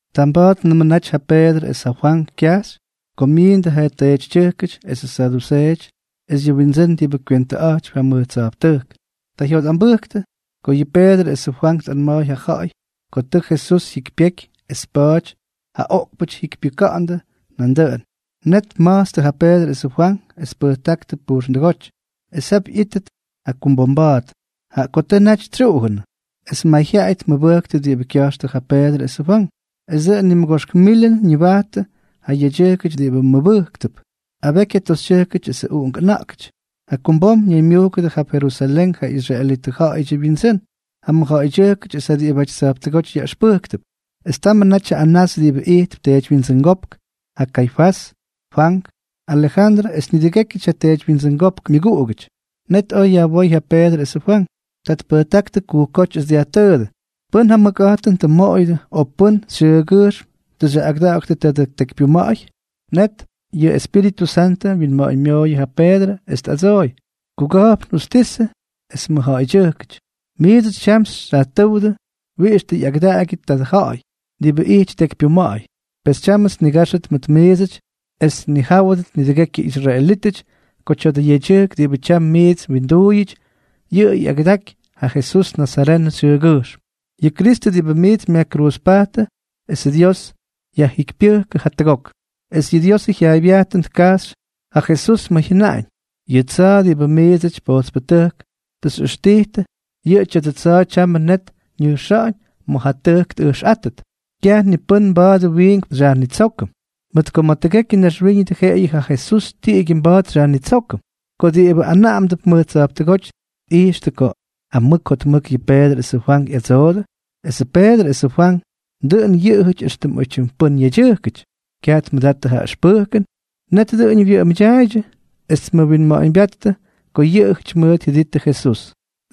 Tamba̱a̱tnʉmʉ naty ja Peedrʉ es ja Fwank kyajxy ko myiindʉ ja teetytyʉjkʉty esʉ saduseeʉty es yʉ windsʉ́n diꞌibʉ kywentʉꞌa̱jtypy ja mʉj tsa̱jptʉjk. Ta jyotꞌambʉjktʉ ko yʉ Peedrʉ es ja Fwank tꞌanma̱a̱y ja ja̱ꞌa̱y ko tʉ Jesús jyikypyeky es pa̱a̱ty ja oꞌkpʉtʉjk jyikypyʉka̱ꞌa̱ndʉ nandʉꞌʉn. Net tma̱jtstʉ ja Peedrʉ esʉ Fwank, es tpʉjtáktʉ pujxndʉgóty es jap ꞌyítʉt jakumbomba̱a̱t, jaꞌa ko tʉ naty tsyuꞌujʉnʉ. Es mayjyaꞌay tmʉbʉjktʉ diꞌibʉ kya̱jxtʉ ja Peedrʉ esʉ Fwank. Es dʉꞌʉn nimʉgoxk milʉn ñaybyatʉ ja yedyʉjkʉty diꞌibʉ mʉbʉjktʉp, abeky ja toxytyʉjk es uꞌunk ʉna̱ꞌkʉty. Jakumbom ñaymyujkʉdʉ jap Jerusalén ja israelitʉ ja̱ꞌa̱yʉdyʉ wyindsʉ́n, ja mʉjja̱ꞌa̱ydyʉjkʉty es ja diꞌibʉty tsa̱jptʉgóty yaꞌʉxpʉjktʉp. Es tamʉ natyʉ Anás diꞌibʉ ijtp teedywyindsʉngópk, ja Kaifás, Fwank, Alejandrʉ es nidʉgékyʉty ja teedywyindsʉngópkʉ myʉguꞌugʉty. Net oj yajwóy ja Peedrʉ esʉ Fwank. Ta tpʉjtáktʉ kujkjóty, es dyajtʉʉdʉ: —¿Pʉ́n ja mʉkꞌa̱jtʉn tʉ mmoꞌoyʉdʉ, o pʉ́n xyʉʉgyʉjxm tʉ xyaꞌꞌagʉda̱ꞌa̱ktʉ tadʉ tekypyuma̱ꞌa̱y? Net yʉ Espíritʉ Santʉ wyinma̱ꞌa̱ñmyooyʉ ja Peedrʉ, es tꞌadsooy: —Kuga̱jpn justisʉ es mʉjja̱ꞌa̱ydyʉjkʉty, miidsʉty tyam xyajtʉ́wdʉ wiꞌix tʉ ꞌyagʉdaꞌagyʉ tadʉ ja̱ꞌa̱y diꞌibʉ ijty tekypyuma̱ꞌa̱y. Pes tyámʉts nniga̱jxʉt mʉt miidsʉty es tnijáwʉdʉt nidʉgekyʉ israelítʉty ko tya̱dʉ yedyʉjk diꞌibʉ tyam miits mwinduuyʉty, yʉꞌʉ ꞌyagʉdaky ja Jesús nazarenʉ xyʉʉgyʉjxm, yʉ Kristʉ diꞌibʉ miits myajkruuzpajttʉ esʉ Dios yajjikypyʉjk jatʉgok. Es yʉ Diosʉ jyaaybyajtʉn tkajxy ja Jesús ma̱ jyʉnaꞌañ: “Yʉ tsa̱a̱ diꞌibʉ miidsʉty pojtspʉtʉjk xyꞌʉxtijtʉ, yʉ tya̱dʉ tsa̱a̱ tyamʉ net ñʉjxa̱ꞌa̱ñ ma̱ ja tʉjk tꞌʉjxꞌátʉt.” Kyaj ni pʉ́n mba̱a̱dʉ wiinkpʉ xyajnitsókʉm, mʉt ko ma̱ tʉgekyʉ naxwíñʉdʉ jeꞌeyʉ ja Jesús tiꞌigyʉ mba̱a̱t xyajnitsókʉm. Ko diꞌibʉ anaꞌamdʉp mʉj tsa̱jptʉgóty tꞌijxtʉ ko amʉk jotmʉk yʉ Peedrʉ esʉ Fwank ꞌyadsoodʉ, esʉ Peedrʉ esʉ Fwank dʉꞌʉn yʉꞌʉjʉty éxtʉm oytyim pʉ́n yedyʉjkʉty, kyaj tmʉdattʉ ja ʉxpʉjkʉn, net dʉꞌʉñʉ wyʉꞌʉmʉdyaaydyʉ, es tmʉwinma̱ꞌa̱ñbyáttʉ ko yʉꞌʉjʉty mʉʉt jyʉdijttʉ Jesús.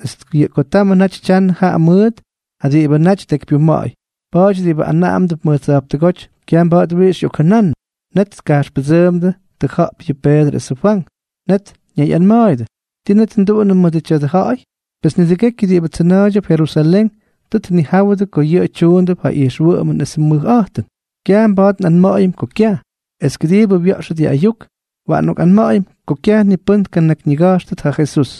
Es jaꞌa ko tamʉ naty tyanʉ jaꞌa mʉʉt ja diꞌibʉ naty tekypyuma̱ꞌa̱y, pa̱a̱ty diꞌibʉ anaꞌamdʉp mʉj tsa̱jptʉgóty kyaj mba̱a̱t wiꞌix ꞌyokjʉnannʉ. Net tkajxpʉdsʉʉmdʉ tʉja̱ꞌp yʉ Peedrʉ esʉ Fwank. Net ñayꞌanma̱a̱yʉdʉ: —¿Ti net nduꞌunʉm mʉdʉ tya̱dʉ ja̱ꞌa̱y? Pes nidʉgekyʉ diꞌibʉ tsʉna̱a̱ydyʉp Jerusalén tʉ tnijáwʉdʉ ko yʉꞌʉ tyuundʉp ja ijxwʉꞌʉmʉn esʉ mʉjꞌa̱jtʉn. Kyaj mba̱a̱t nꞌanma̱ꞌa̱yʉm ko kyaj. Es kʉdiibʉ wya̱ꞌxʉt yʉ ayuk, waꞌan nꞌokꞌanma̱ꞌa̱yʉm ko kyaj ni pʉ́n tnakyñiga̱jxtʉt ja Jesús.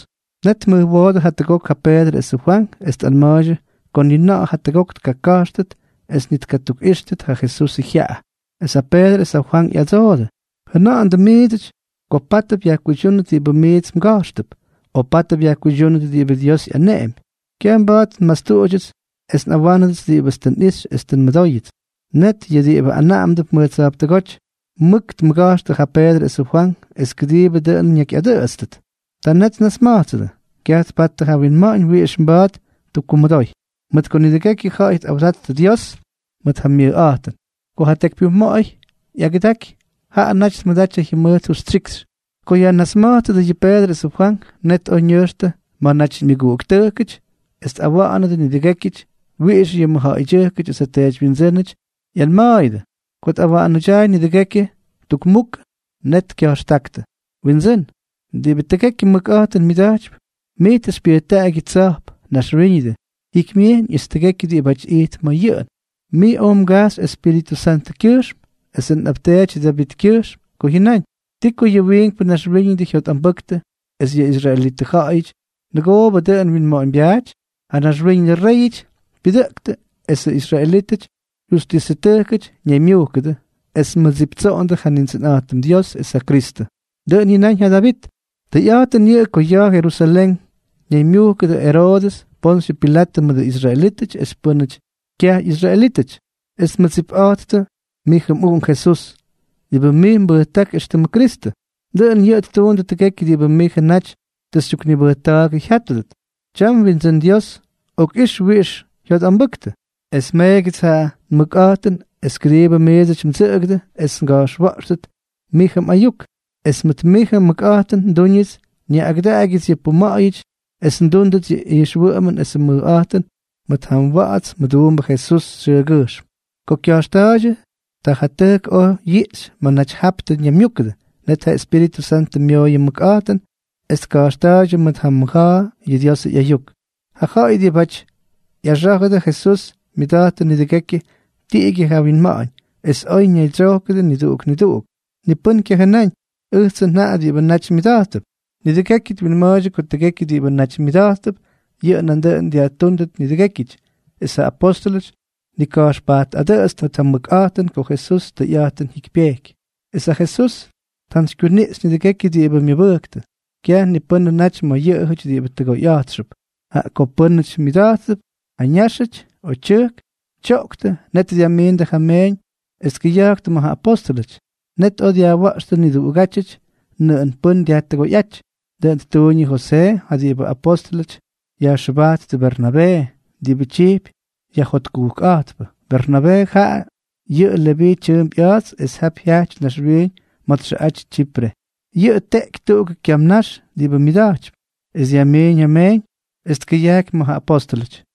Net tmʉjwoodʉ jatʉgok ja Peedrʉ esʉ Fwank es tꞌanma̱a̱ydyʉ ko ni na̱ꞌa̱ jatʉgok tkaka̱jxtʉt es ni tkatukꞌíxtʉt ja Jesusʉ jyaꞌa. Es ja Peedrʉ es ja Fwank ꞌyadsoodʉ: —Jʉna̱ꞌa̱ndʉ miidsʉty ko pátʉp yajkuydyúnʉt diꞌibʉ miits mga̱jxtʉp, o pátʉp yajkuydyúnʉt diꞌibʉ Dios ꞌyaneꞌempy. Kyaj mba̱a̱t nmastuꞌudyʉts es nꞌawánʉdʉts diꞌibʉts tʉ nꞌixy es tʉ nmʉdóyʉts. Net yʉ diꞌibʉ anaꞌamdʉp mʉj tsa̱jptʉgóty mʉk tmʉga̱jxtʉ ja Peedrʉ esʉ Fwank es kʉdiꞌibʉ dʉꞌʉn ñakyꞌadʉꞌʉtstʉt. Ta net tnasma̱jtsʉdʉ. Kyaj tpattʉ ja winma̱ꞌa̱ñ wiꞌix mba̱a̱t ttukkumʉdoy, mʉt ko nidʉgekyʉ ja̱ꞌa̱y tꞌawdattʉ Dios mʉt ja myʉjꞌa̱jtʉn. Ko ja tekypyuma̱ꞌa̱y ꞌyagʉdaky, jaꞌa naty tmʉdaty ja jyʉmʉjt justyikxy. Ko yajnasma̱jtsʉdʉ yʉ Peedrʉ esʉ Fwank, net oj ñʉjxtʉ ma̱ naty yʉ myʉguꞌuktʉjkʉty es tꞌawa̱ꞌa̱nʉdʉ nidʉgékyʉty wiꞌix yʉ mʉjja̱ꞌa̱ydyʉjkʉty es ja teedywyindsʉ́nʉty ꞌyanma̱a̱yʉdʉ. Ko tꞌawa̱ꞌa̱nʉdyaay nidʉgekyʉ tukmukʉ, net kya̱jxtáktʉ: —Windsʉ́n, diꞌibʉ tʉgekyʉ mʉkꞌa̱jtʉn myʉda̱jtypy, mij tʉ xypyʉjtaꞌaky yʉ tsa̱jp, naxwíñʉdʉ, jikymyejyñ es tʉgekyʉ diꞌibáty ijtp ma̱ yʉꞌʉn. Mij oj mgajxy Espíritʉ Santʉkyʉjxm esʉ nꞌapteety Davitkyʉxm ko mjʉnáñ: ¿Ti ko yʉ wiinkpʉ naxwíñʉdʉ jyotꞌambʉktʉ es yʉ israelitʉ ja̱ꞌa̱yʉty nʉgoobʉ dʉꞌʉn wyinma̱ꞌa̱ñbyaaty? Ja naxwíñʉdʉ réyʉty pyʉdʉꞌktʉ esʉ israelítʉty ja jyustisʉtʉjkʉty ñaymyujkʉdʉ es tmʉdsiptsoꞌondʉ ja Nindsʉnꞌa̱jtʉm Dios es ja Kristʉ. Dʉꞌʉn jyʉnáñ ja Davit. ’Tʉyꞌa̱jtʉn yʉꞌʉ ko ya̱a̱ Jerusalén ñaymyujkʉdʉ Eroodʉs, Ponsyʉ Pilatʉ mʉdʉ israelítʉty es pʉ́nʉty kyaj ꞌyisraelítʉty, es tmʉdsipꞌa̱jttʉ mijʉ mꞌUꞌunk Jesús, diꞌibʉ mij mbʉjták éxtʉmʉ Kristʉ. Dʉꞌʉn yʉꞌʉ ttuundʉ tʉgekyʉ diꞌibʉ mijʉ naty tʉ xytyuknibʉjta̱a̱gʉ jyátʉdʉt. Tyam, Windsʉ́n Dios, okꞌix wiꞌix jyotꞌambʉktʉ, es meegyʉts ja mʉkꞌa̱jtʉn es kʉdiibʉ ʉʉdsʉty ndsʉꞌʉgʉdʉ esʉts nga̱jxwa̱ꞌxtʉt mijʉ mꞌayuk. Es mʉt mijʉ mmʉkꞌa̱jtʉn ndúñʉts nyaꞌꞌagʉdaꞌagyʉts yʉ puma̱ꞌa̱yʉty es ndúndʉts yʉ ijxwʉꞌʉmʉn esʉ mʉjꞌa̱jtʉn mʉt ja mwa̱ꞌa̱ts mʉduumbʉ Jesús xyʉʉgyʉjxm. Ko kya̱jxtakta̱a̱ydyʉ, ta ja tʉjk oj yiꞌxy ma̱ naty jap tʉ ñaymyúkʉdʉ. Net ja Espíritʉ Santʉ myooyʉ mʉkꞌa̱jtʉn, es tka̱jxta̱a̱ydyʉ mʉt ja mʉja̱a̱ yʉ Diosʉ ꞌyayuk. Ja ja̱ꞌa̱y diꞌibʉty ꞌyꞌaxá̱jʉdʉ Jesús myʉda̱jttʉ nidʉgekyʉ tiꞌigyʉ ja winma̱ꞌa̱ñ es oy ñaydsyojkʉdʉ niduꞌuk niduꞌuk. Ni pʉ́n kyajʉnáñ “ʉjtsʉ njaꞌa” diꞌibʉ naty myʉda̱jttʉp. Nidʉgekyʉ twinma̱a̱ydyʉ ko tʉgekyʉ diꞌibʉ naty myʉda̱jttʉp, yʉꞌʉ nandʉꞌʉn dyajtúndʉt nidʉgékyʉty. Es ja apóstʉlʉty tnika̱jxpajtꞌadʉꞌʉtstʉ mʉt ja mʉkꞌa̱jtʉn ko Jesús tʉyꞌa̱jtʉn jyikypyejky, es ja Dios tjantsykyuniꞌxy nidʉgékyʉty diꞌibʉ myʉbʉjktʉ. Kyaj ni pʉ́nʉ naty ma̱ yʉꞌʉjʉty diꞌibʉ tʉgoyꞌa̱jtxʉp. Jaꞌa ko pʉ́nʉty myʉda̱jttʉp ja ñáxʉty o tyʉjk, tyoꞌktʉ, net dyajmiindʉ ja meeñ es tkʉya̱jktʉ ma̱ ja apóstʉlʉty. Net oj dyajwa̱ꞌxtʉ niduꞌugátyʉty nʉꞌʉn pʉ́n dyajtʉgoyꞌáty. Dʉꞌʉn ttuuñ yʉ Josee, ja diꞌibʉ apóstʉlʉty yajxʉbajttʉ Bernabee, diꞌibʉ tyijpy Yajjotkujkꞌa̱jtpʉ. Bernabee, jaꞌa yʉꞌʉ Leví tyʉʉmp ꞌya̱a̱ts es jap jyajty naxwiiñ ma̱ txʉꞌaty Tsyipre. Yʉꞌʉ tteꞌky tuꞌugʉ kyam nax diꞌibʉ myʉda̱jtypy, es dyajmiiñ ja meeñ es tkʉyajky ma̱ ja apóstʉlʉty.